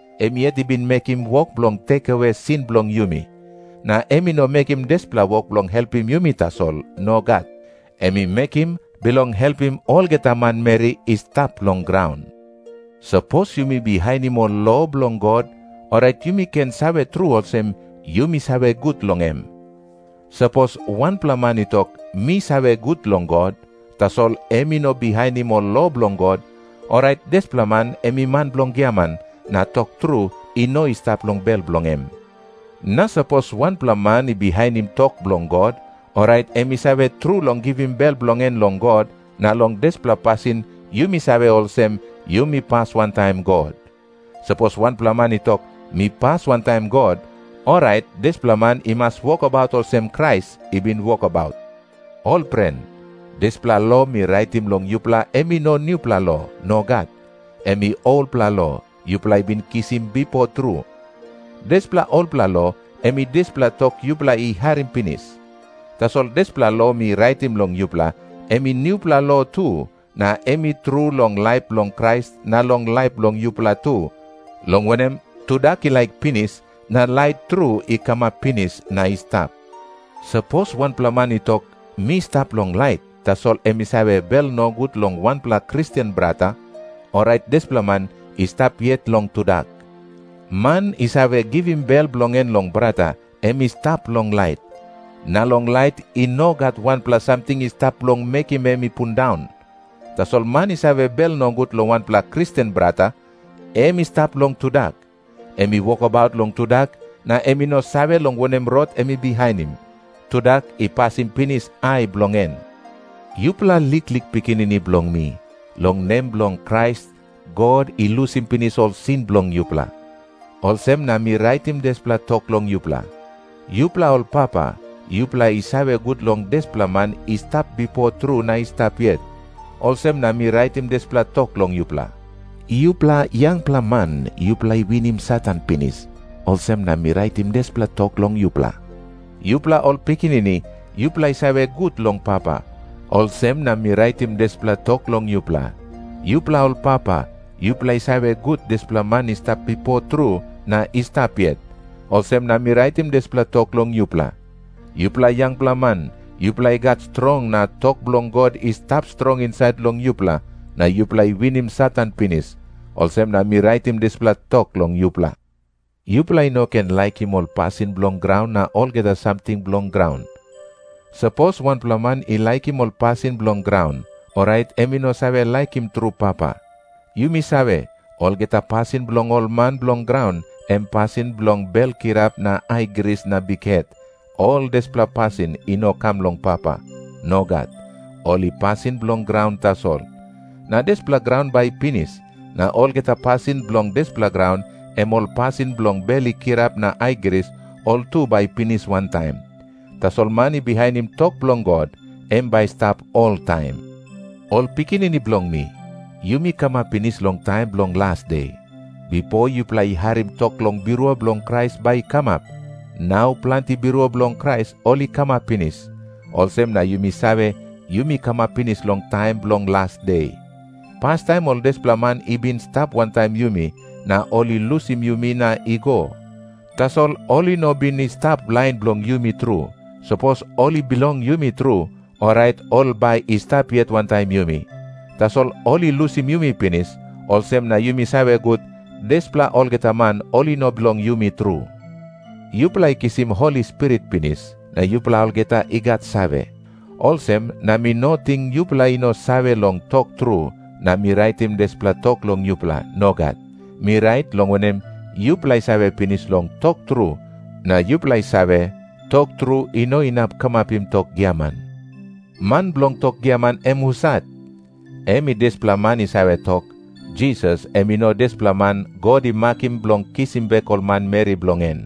Em yet i bin mekim wok bilong rausim sin bilong yumi. Na em i no mekim dispela wok bilong helpim yumi tasol. Nogat. Em i mekim bilong helpim olgeta manmeri i stap long graun. Sapos yumi bihainim ol lo bilong God, orait yumi ken save tru olsem, yumi save gut long em. Sapos wanpela man i tok, “Mi save gut long God,” tasol em i no bihainim ol lo bilong God, orait dispela man em i man bilong giaman, na tok tru i no i stap long bel bilong em. Na sapos wanpela man i bihainim tok bilong God, orait em i save tru long givim bel bilong en long God, na long dispela pasin yumi save olsem, yumi pas wantaim God. Sapos wanpela man i tok, “Mi pas wantaim God,” orait dispela man i mas wokabaut olsem Krais i bin wokabaut. Ol pren, dispela lo mi raitim long yupela em i no nupela lo. Nogat. Em i olpela lo, yupela i bin kisim bipo tru. Dispela olpela lo, em i dispela tok yupela i harim pinis. Tasol dispela lo mi raitim long yupela, em i nupela lo tu, na em i tru long laip bilong Krais na long laip bilong yupela tu, long wanem, tudak i laik pinis, na lait tru i kamap pinis na i stap. Sapos wanpela man i tok, “Mi stap long lait,” tasol em i save bel nogut long wanpela Kristen brata, orait dispela man i stap yet long tudak. Man i save givim bel bilong en long brata, em i stap long lait. Na long lait i no gat wanpela samting i stap bilong mekim em i pundaun. Tasol man i save bel nogut long wanpela Kristen brata, em i stap long tudak. Em i wokabaut long tudak, na em i no save long wanem rot em i bihainim. Tudak i pasim pinis ai bilong en. Yupela liklik pikinini bilong mi, long nem bilong Krais God i lusim pinis ol sin bilong yupela. Olsem na mi raitim dispela tok long yupela. Yupela ol papa, yupela i save gut long dispela man i stap bipo tru na i stap yet. Olsem na mi raitim dispela tok long yupela. Yupela yangpela man, yupela i winim Satan pinis. Olsem na mi raitim dispela tok long yupela. Yupela ol pikinini, yupela i save gut long Papa. Olsem na mi raitim dispela tok long yupela. Yupela ol papa, yupela i save gut long dispela man i stap bipo tru na i stap yet. Olsem na mi raitim dispela tok long yupela. Yupela yangpela man, yupela i gat strong, na tok bilong God i stap strong insait long yupela, na yupela i winim Satan pinis. Olsem na mi raitim dispela tok long yupela. Yupela i no ken laikim ol pasin bilong graun na olgeta samting bilong graun. Sapos wanpela man i laikim ol pasin bilong graun, orait em i no save laikim tru Papa. Yumi save, olgeta pasin bilong ol man bilong graun, em pasin bilong bel kirap na aigris na bikhet, ol dispela pasin i no kam long Papa. Nogat. Ol i pasin bilong graun tasol. Na dispela graun bai i pinis, na olgeta pasin bilong dispela graun, em ol pasin bilong bel i kirap na aigris, ol tu bai i pinis wantaim. Tasol man i bihainim tok bilong God, em bai i stap oltaim. Ol pikinini bilong mi, yumi kamap pinis long taim bilong las de. Bipo yupela i harim tok long birua bilong Krais bai i kamap. Nau planti birua bilong Krais ol i kamap pinis. Olsem na yumi save, yumi kamap pinis long taim bilong las de. Pastaim ol dispela man i bin i stap wantaim yumi, na ol i lusim yumi na i go. Tasol ol i no bin i stap lain bilong yumi tru. Sapos ol i bilong yumi tru, orait ol bai i stap yet wantaim yumi. Tasol ol i lusim yumi pinis, olsem na yumi save gut, dispela olgeta man ol i no bilong yumi tru. Yupela i kisim Holi Spirit pinis, na yupela olgeta i gat save. Olsem na mi no ting yupela i no save long tok tru, na mi raitim dispela tok long yupela. Nogat. Mi rait, long wanem, yupela i save pinis long tok tru, na yupela i save, tok tru i no inap kamapim tok giaman. Man bilong tok giaman em husat? Em i dispela man i save tok, “Jisas em i no dispela man God i makim bilong kisim bek ol manmeri bilong en.”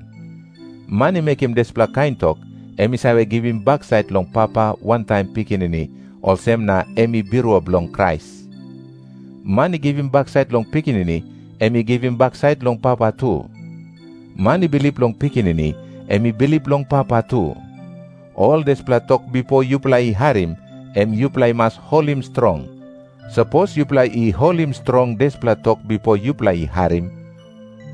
Man i mekim dispela kain tok, em i save givim baksait long Papa wantaim Pikinini, olsem na em i birua bilong Krais. Man i givim baksait long Pikinini, em i givim baksait long Papa tu. Man i bilip long Pikinini, em i bilip long Papa tu. Ol dispela tok bipo yupela i harim, em yupela i mas holim strong. Sapos yupela i holim strong dispela tok bipo yupela i harim,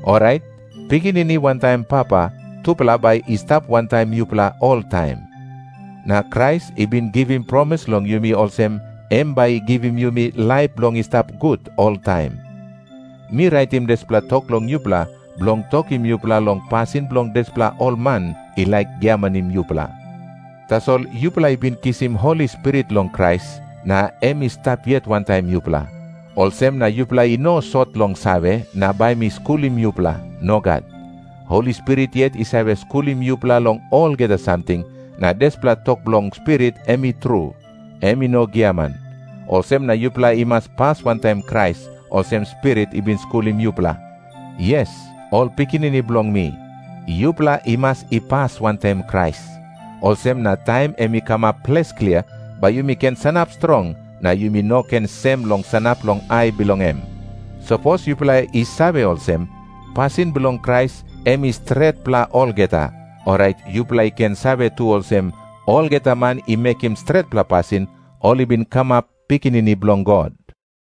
orait Pikinini wantaim Papa tupela bai i stap wantaim yupela oltaim. Na Krais i bin givim promis long yumi olsem, em bai i givim yumi laip bilong i stap gut oltaim. Mi raitim dispela tok long yupela bilong tokim yupela long pasin bilong dispela ol man i laik giamanim yupela. Tasol yupela i bin kisim Holi Spirit long Krais, na em i stap yet wantaim yupela. Olsem na yupela i no sot long save, na bai mi skulim yupela. Nogat. Holi Spirit yet i save skulim yupela long olgeta samting, na dispela tok bilong Spirit em i tru. Em i no giaman. Olsem na yupela i mas pas wantaim Krais, olsem Spirit i bin skulim yupela. Yes, ol pikinini bilong mi, yupela i mas i pas wantaim Krais. Olsem na taim em i kamap ples klia, bai yumi ken sanap strong, na yumi no ken sem long sanap long ai bilong em. Sapos yupela i save olsem, pasin bilong Krais em i stretpela olgeta, orait yupela i ken save tu olsem, olgeta man i mekim stretpela pasin, ol i bin kamap pikinini bilong God.